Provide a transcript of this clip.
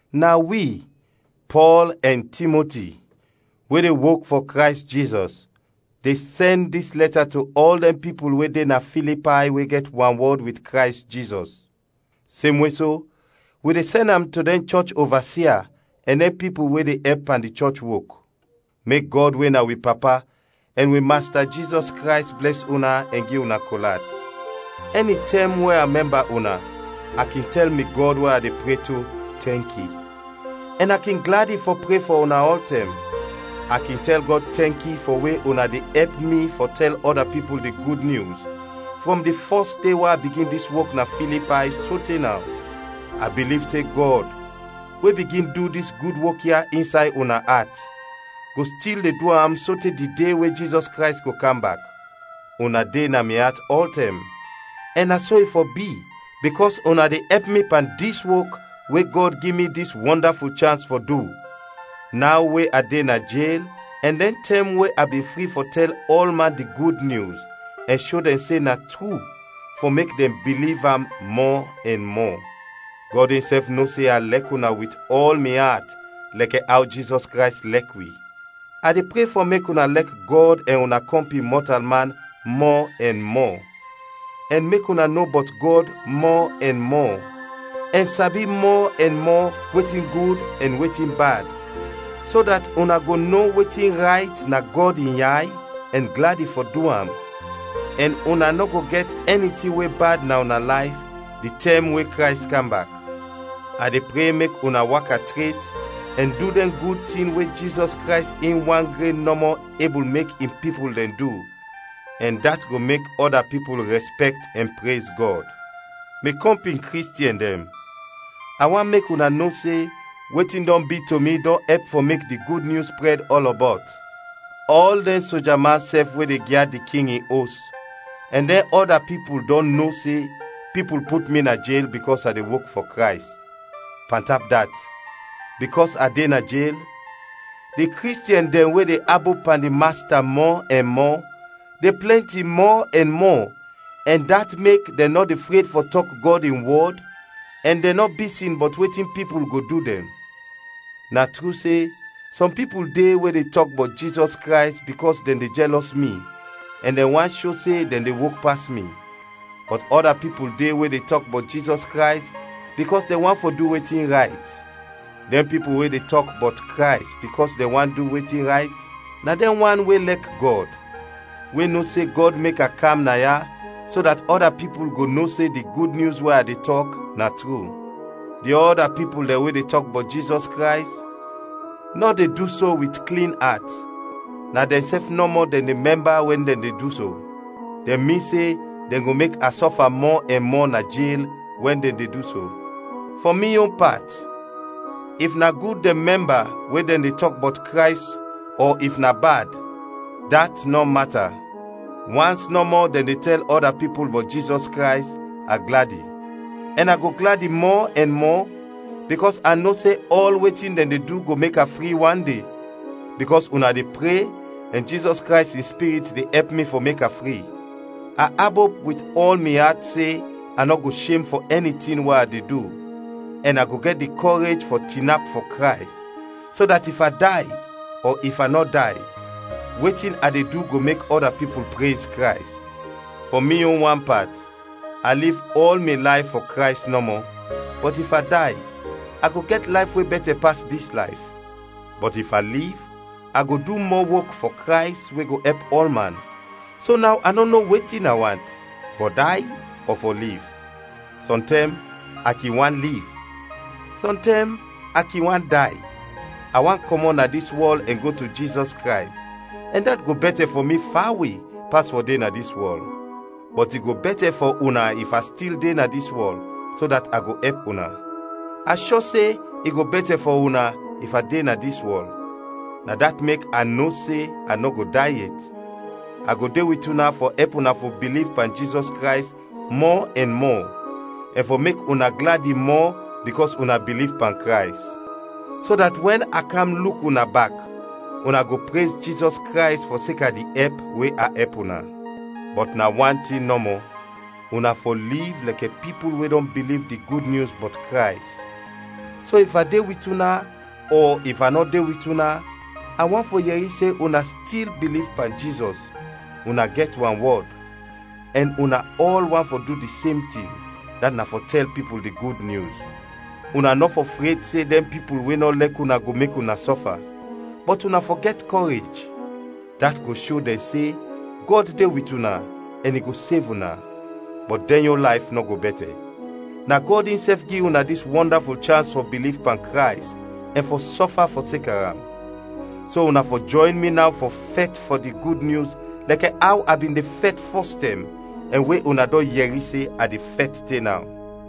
Na wi, Pɔl ɛn Timoti, we de wok fɔ Krays Jizɔs, de sɛn dis lɛta to ɔl dɛn pipul we de na Filipay we gɛt wanwɔd wit Krays Jizɔs. Semwe so, wi de sɛn am to dɛn chɔch ovasia ɛn dɛn pipul we de ɛp pan di chɔch wok. Mek Gɔd we na wi Papa ɛn wi Masta Jizɔs Krays blɛs una ɛn gi una kol at. Ɛnitɛm we a mɛmba una a kin tɛl mi Gɔd we a de pre to, tɛnki; ɛn a kin gladi fɔ pre fɔ una ɔltɛm. A kin tɛl Gɔd tɛnki fɔ we una de ɛp mi fɔ tɛl ɔda pipul di Gud Nyus frɔm di fɔs de we a bigin dis wok na Filipay sote naw. A biliv se Gɔd, we bigin du dis gud wok ya insay una at, go stil de du am sote di de we Jizɔs Krays go kam bak. Una de na mi at ɔltɛm ɛn na so i fɔ bi bikɔs una de ɛp mi pan dis wok, we Gɔd gi mi dis wɔndaful chans fɔ du, naw we a de na jel ɛn dɛn tɛm we a bin fri fɔ tɛl ɔlman di Gud Nyus ɛn sho dɛn se na tru, fɔ mek dɛn biliv am mɔ ɛn mɔ. Gɔd insɛf no se a lɛk una wit ɔl mi at lɛkɛ aw Jizɔs Krays lɛk wi. A de pre fɔ mek una lɛk Gɔd ɛn una kɔmpin mɔtalman mɔ ɛn mɔ, ɛn mek una no bɔt Gɔd mɔ ɛn mɔ, ɛn sabi mɔ ɛn mɔ wetin gud ɛn wetin bad, so dat una go no wetin rayt na Gɔd in yay ɛn gladi fɔ du am, ɛn una nɔ go gɛt ɛni tin we bad na una layf di tɛm we Krays kam bak. A de pre mek una waka tret ɛn du dɛn gud tin we Jizɔs Krays in wan gren nɔmɔ ebul mek in pipul dɛn du, ɛn dat go mek ɔda pipul rɛspɛkt ɛn prez Gɔd. Mi kɔmpin Kristiɛn dɛn, a want mek una no se wetin dɔn bi to mi dɔn ɛp fɔ mek di Gud Nyus prɛd ɔlɔbɔt. Ɔl dɛn soja man sɛf we de gyad di King in os ɛn dɛn ɔda pipul dɔn no se pipul put mi na jel bikɔs a de wok fɔ Krays. Pantap dat, bikɔs a de na jel, di Kristiɛn dɛn we de abop pan di Masta mɔ ɛn mɔ, de plɛnti mɔ ɛn mɔ ɛn dat mek dɛn nɔ de fred fɔ tɔk Gɔd in wɔd ɛn dɛn nɔ bisin bɔt wetin pipul go du dɛn. Na tru se, sɔm pipul de we de tɔk bɔt Jizɔs Krays bikɔs dɛn de jɛlɔs mi ɛn dɛn want sho se dɛn de wok pas mi, bɔt ɔda pipul de we de tɔk bɔt Jizɔs Krays bikɔs dɛn want fɔ du wetin rayt. Dɛn pipul we de tɔk bɔt Krays bikɔs dɛn want du wetin rayt na dɛn wan we lɛk Gɔd, we no se Gɔd mek a kam na ya so dat ɔda pipul go no se di Gud Nyus we a de tɔk, na tru. Di ɔda pipul dɛn we de tɔk bɔt Jizɔs Krays, nɔ de du so wit klin at, na dɛnsɛf nɔmɔ dɛn de mɛmba wɛn dɛn de du so; dɛn min se dɛn go mek a sɔfa mɔ ɛn mɔ na jel we dɛn de du so. Fɔ mi yon pat, if na gud dɛn mɛmba we dɛn de tɔk bɔt Krays ɔ if na bad, dat nɔ mata; wans nɔmɔ dɛn de tɛl ɔda pipul bɔt Jizɔs Krays, a gladi; ɛn a go gladi mɔ ɛn mɔ, bikɔs a no se ɔl wetin dɛn de du go mek a fri wan de, bikɔs una de pre ɛn Jizɔs Krays in Spirit de ɛp mi fɔ mek a fri. A abop wit ɔl mi at se a nɔ go shem fɔ ɛni tin we a de du, ɛn a go gɛt di kɔrej fɔ tinap fɔ Krays, so dat if a day ɔ if a nɔ day, wetin a de du go mek ɔda pipul prez Krays. Fɔ mi yon wan pat, a liv ɔl mi layf fɔ Krays nɔmɔ, bɔt if a day, a go gɛt layf we bɛtɛ pas dis layf. Bɔt if a liv a go du mɔ wok fɔ Krays we go ɛp ɔlman, so naw a nɔ no wetin a want: fɔ day ɔ fɔ liv. Sɔntɛm a kin want liv, sɔntɛm a kin want day: a want kɔmɔt na dis wɔl ɛn go to Jizɔs Krays, ɛn dat go bɛtɛ fɔ mi fawe pas fɔ de na dis wɔl, bɔt i go bɛtɛ fɔ una if a stil de na dis wɔl, so dat a go ɛp una. A shɔ se i go bɛtɛ fɔ una if a de na dis wɔl, na dat mek a no se a nɔ go day yet, a go de wit una fɔ ɛp una fɔ biliv pan Jizɔs Krays mɔ ɛn mɔ, ɛn fɔ mek una gladi mɔ bikɔs una biliv pan Krays. So dat wɛn a kam luk una bak, una go prez Jizɔs Krays fɔseka di ɛp we a ɛp una. Bɔt na wan tin nɔmɔ, una fɔ liv lɛkɛ pipul we dɔn biliv di Gud Nyus bɔt Krays. So if a de wit una, ɔ if a nɔ de wit una, a want fɔ yɛri se una stil biliv pan Jizɔs, una gɛt wanwɔd, ɛn una ɔl want fɔ du di sem tin, dat na fɔ tɛl pipul di Gud Nyus. Una nɔ fɔ fred se dɛn pipul we nɔ lɛk una go mek una sɔfa, bɔt una fɔ gɛt kɔrej; dat go sho dɛn se Gɔd de wit una ɛn i go sev una, bɔt dɛn yon layf nɔ go bɛtɛ. Na Gɔd insɛf gi una dis wɔndaful chans fɔ biliv pan Krays ɛn fɔ sɔfa fɔseka am. So una fɔ jɔyn mi naw fɔ fɛt fɔ di Gud Nyus lɛkɛ aw a bin de fɛt fɔs tɛm ɛn we una dɔn yɛri se a de fɛt te naw.